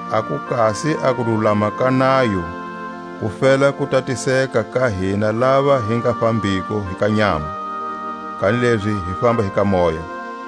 A ku kasi a kululama ka nayo ku fela ku tatiseka ka hina lava hi nga fambiko hi ka nyama, kanilezi hi famba hi ka moya.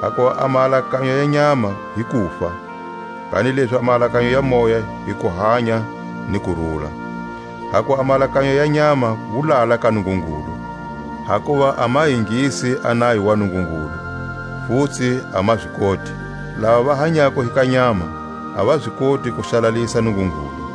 Hakuva a maalakanyo ya nyama hi kufa, kanilezi a maalakanyo ya Moya hi kuhanya ni kurula. Hakuva a maalakanyo ya nyama wulala ka Nungungulu; hakuva a ma ingisi a nayo wa Nungungulu, futsi a ma zi koti. Lava va hanyako hi ka nyama a va zi koti ku xalalisa Nungungulu.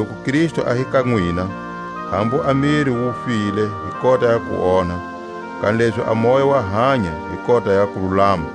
Loku Kristu a hi ka nwina, hambu a miri wu file hi kota ya kuonha, kanilezi a moya wa hanya hi kota ya kululama.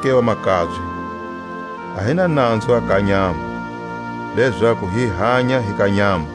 Hilezoke vamakabye, a hi na nanzu a ka nyama, lezaku hi hanya hi ka nyama;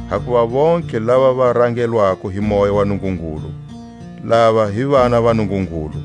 Hakuva vontlhe lava va rangelwako hi Moya wa Nungungulu, lava hi vana va Nungungulu.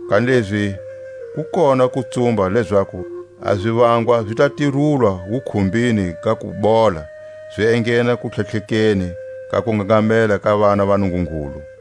kanilezi ku kona kutsumba lezaku a zivangwa zi ta tirulwa wukhumbini ga kubola zi enghena kutlhatlhekeni ka kungangamela ka vana va Nungungulu.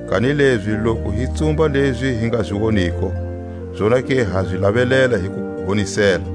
Kanilezi loku hi tsumba lezi hi nga zi woniko, zonake ha zi lavelela hi kuhonisela.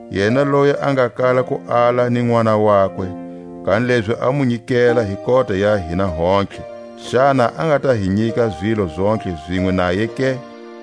Yena loyi a nga kala ku ala ni Nʼwana wakwe, kanilezi a mu nyikela hi kota ya hina hontlhe, xana a nga ta hi nyika zilo zontlhe zinwe naye ke?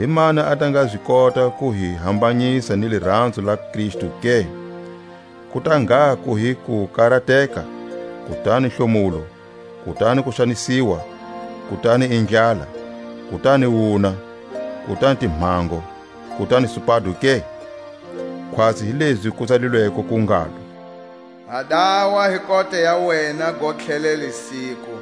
Himani a ta nga zi kota ku hi hambanyisa ni liranzo la Kristu ke? Ku ta ngha ku hi kukarateka, kutani hlomulo, kutani kuxanisiwa, kutani i ndlala, kutani wuna, kutani timhango, kutani supado ke? Khwatsi hi lezi ku tsalilweko ku ngalo: Ha dawa hi kota ya wena gontlhelele siku;